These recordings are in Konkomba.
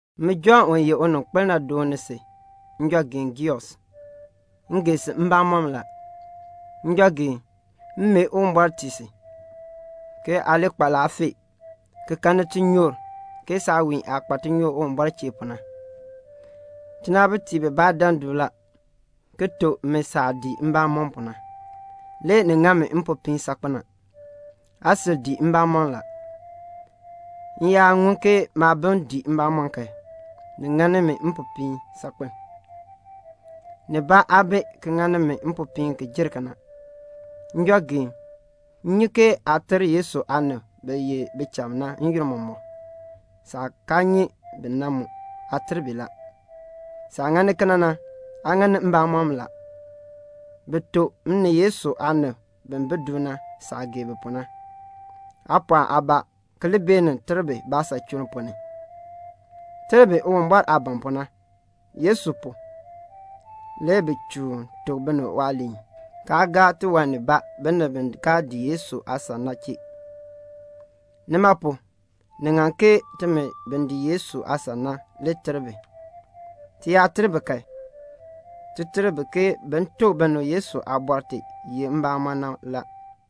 Min Jɔnn u ye uninkpil na dooni si, njɔgeen Geus. M gee si mbamɔm la. Njɔgeen, m mee Uwumbɔr tii si, ke aa li kpa laafee, ki kanni tinyoor, ke saawiin aah kpa tinyoor Uwumbɔr chee pu na. Tinaabitiib bibaa dan du la, ki tuk mi saah dii mbamɔm pu na. Le ni ŋa mi mpopiin saakpen a. Aa sil dii mbamɔm la. M yaa ŋun ke maabim dii mbamɔm kan, ni ŋa mi mpopiin la. Nibaa aa bi ki ŋa mi mpopiin ki jer kena. Njɔgeen, m nyi ke aa ter Yesu aanib bi ye bicham na n-yoonn mɔmɔk; saah kaa nyi bi na mu, aa ter bi la. Saah ŋani kena na, aa ŋani mbamɔm la. Bi tuk m ni Yesu aanib bi bi du na saah gee bi pu na. Aa pɔɔk aabaa, ki li beenin ter bi baasachuln ponn ni. Ter bi Uwumbɔr aah ban pu na. Yesu pu, le bi chuun tuk binib waaliin, kaa gaa tiwan nibaa binib bi kaa dii Yesu aasan na chee. Nima pu, ni ŋan ke timi bi dii Yesu aasan na li ter bi. Ti yaa ter bi kan, ti ter bi ke bin tuk binib Yesu aabɔr ti ye mbamɔn na la.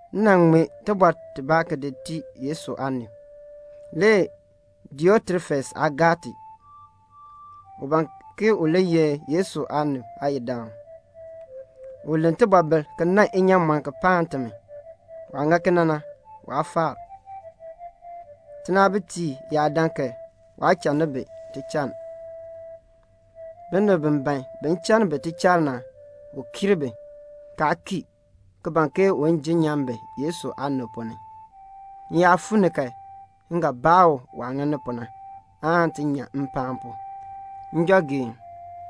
M nan ŋmee tibɔr tibaa ki di tii Yesu aanib. Le Diotrefes aa gar ti. U ban ki u li ye Yesu aanib aayidaan. U len tibɔbil ki nan inyaamɔn ki paan timi. Waah ŋa kena na, waa faar. Tinaabitiib yaa dan kan, waa channi bi tichann. Binib bi ban bin channi bi tichann na, u kiir bi, kaa kii, ki ban ke un jenn nyan bi Yesu aanib ponn ni. M yaa fuu ni kan, m ga baa u waah ŋani pu na, aan ti nyan mpaan pu. Njɔgeen,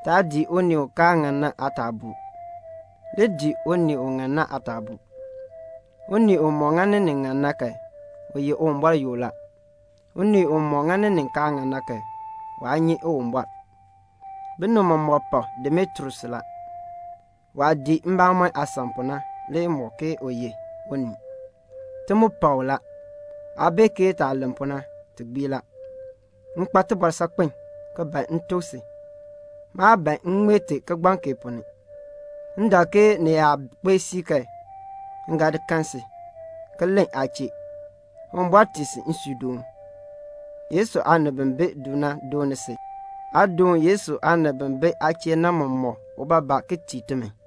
taa dii unii u kaa ŋan na aataabuu. Li dii un ŋan na le aataabuu. Unii umɔk ŋani nin ŋan na kan, u ye Uwumbɔr yoo la. Unii umɔk ŋani nin kaa ŋan na kan, waa nyi Uwumbɔr. Binib mɔmɔk pak Demetrius la. Waah dii mbamɔn aasan pu na le mɔk ke u ye unii. Ti mu pak u la. Aa bee ke taah len pu na, ti gbii la. M kpa tibɔr saakpen, ki ban m tuk si. Maa ban m ŋmee ti kigbaŋ kee ponn ni. M dak ke ni yaa kpee siib kan, m ga kan si, ki len aa chee. Uwumbɔr tii si nsuudoon. Yesu aanib bi bi du na dooni si la. Aa doon Yesu aanib bi bi aa chee na mɔmɔk ubaabaa ki tii timi.